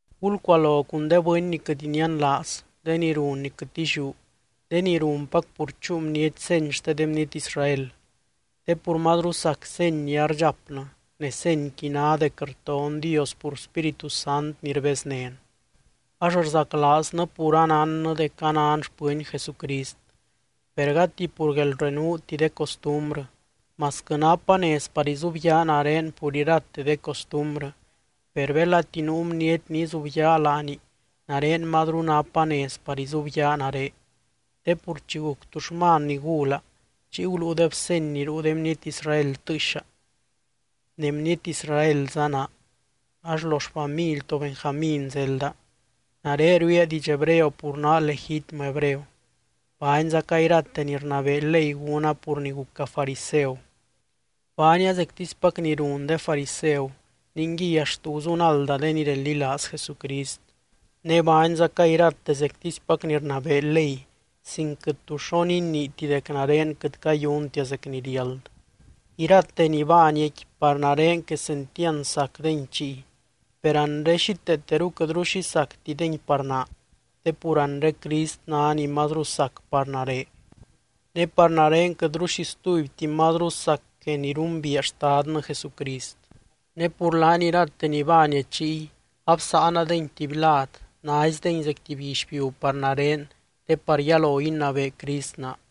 Gulcualo cun de bɨny ni quɨt inianlaaz, de ni run ni quɨt illiú, de ni runpac pur chúu bniety seny xte de bniety Israel. Te pur mazru sac seny ni ardxapnɨ ne senyqui ná dec rton Dios pur Spíritu Sant ni rbeznén. Ax rzaclaaznɨ pur anánnɨ dec anan xpɨny Jesucrist, per gati pur guelrenuuti de costumbrɨ. Masquɨ napa nez par izubyaa nare pur irate de costumbrɨ, per belati nuu bniety ni izubyaa laani, nare mazru napa nez par izubyaa nare. Te pur chi guc tuxman ni gula, chiy guluudeb seny ni ruu de bniety Israel tɨɨxa. Ne bniety Israelza naa, ax lo xfamily to Benjamín zelda. Nare ruiia hebreo pur naa legitmɨ Hebreo. Baanzaca irate ni rnabee ley gúna pur ni guca fariseu. Baania zectispac ni run de fariseu ningui axt guzunalda de ni reldilaaz Jesucrist. Ne baanzaca irate zectispac ni rnabee ley sin quɨt tu xo niniiti dec nare quɨt cayuntia zec ni riáld. Irate ni baaniaqui, par nare quesentiand sacdengui chiy, per anre xíteeteru quɨtru xi sactidengui par naa te pur anre Crist ná ni mazru sac par nare. Ne par nare quɨtru xi stubyti mazru sac que ni rumbiia Xtadnɨ Jesucrist. Ne pur laany irate ni baania chiy, absáanadengui tuby lad naizdengui zec tuby guixbiu par nare te par yalo inabee Crist naa,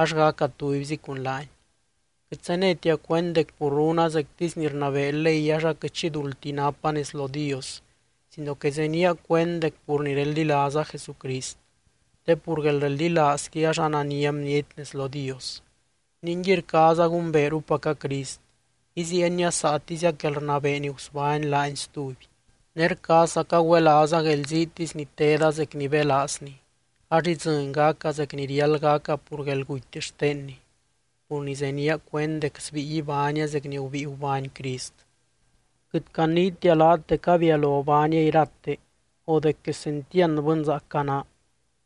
ax gaca tubyzi cun laany. Quɨt zenétia cuend dec pur runa zectisy ni rnabee ley ax aquɨt xi duldti napa nez lo Dios sino que zenía cuend dec pur ni reldilaaza Jesucrist, te pur guelreldilaazqui ax anania bniety nez lo Dios. Ninguiy rcaaza gumbeerupaca Crist, iziienia saatiziac guelrnabee ni gusbány laany stuby, ne rcaazzaca güelaaza guelziitisy ni teda zec ni belaazny. Ax idzɨny gaca zec ni riáld gaca pur guelguty xtenny, pur ni zenía cuend dec sbíi ibánia zec ni gubíi gubány Crist. Quɨt caniitia laat dec abialo baania irate o dec quesentiand bɨnzaac anaa,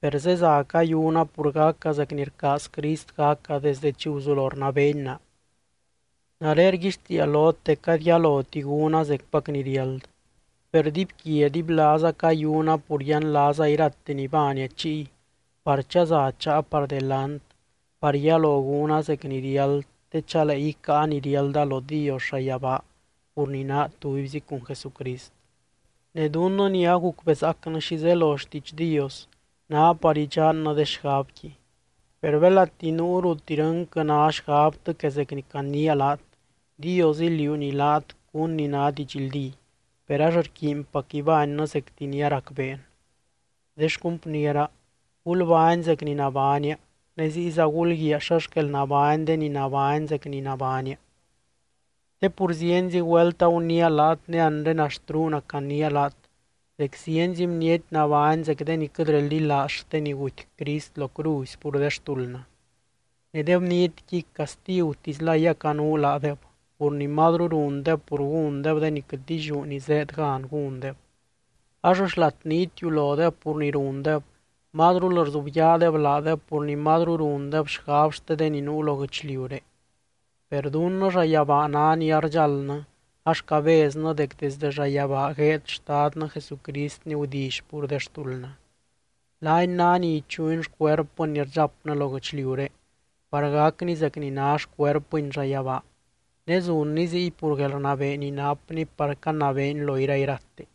per zeza cayuna pur gaca zec ni rcaaz Crist gaca desdɨ chi guzulo rnabeeny naa. Nare rguixtiia lot dec gady yaloti gúna zecpac ni riáld. Per dibyquia dibylaaza cayuna pur yianlaaza irate ni baania chiy par chaza cháa par delant par yalo gúna zec ni riáld te chalee icáa ni riálda lo Dios llayabaa pur ni naa tubyzi cun Jesucrist. Ne dunnɨ ni agucbezaacnɨ xi zelo xtiidx Dios ná par idxannɨ de xgabqui. Per belati nuu rut irɨnquɨ ná xgabtɨ que zec ni caniia laat, Dios iliuuny laat cún ni ná didxldí. Per ax rquiinpac ibánnɨ zecti ni aracbeen. De xcumpniera, gulbány zec ni nabánia ne ziyza gulguiaa xa xquel nabány de ni nabány zec ni nabánia. Te pur zienzi güelt aguniia laat ne anre axt ruuna caniia laat dec zienzi bniety nabány zec de ni quɨt reldilaaz xte ni guty Crist lo cruzy pur de xtuldnɨ. Ne de bnietqui castigutislay acanuu laadeb pur ni mazru rundeb pur gúndeb de ni quɨt illiú ni zéed gan gúndeb. Ax xlat ni itiulodeb pur ni rundeb, mazrul rzubyaadeb laadeb pur ni mazru rundeb xgab xte de ni nuu lo guɨchliuré. Per dunnɨ llayabaa ná ni ardxaldnɨ ax cabeznɨ dec desdɨ llayabaa gueed Xtadnɨ Jesucrist ni gudilly pur de xtuldnɨ. Laany ná ni ichuny xcuerpɨn ni rdxapnɨ lo guɨchliuré par gacni zec ni ná xcuerpɨny llayabaa, ne zunny ziy pur guelrnabee ni napny par canabeeny lo irairate.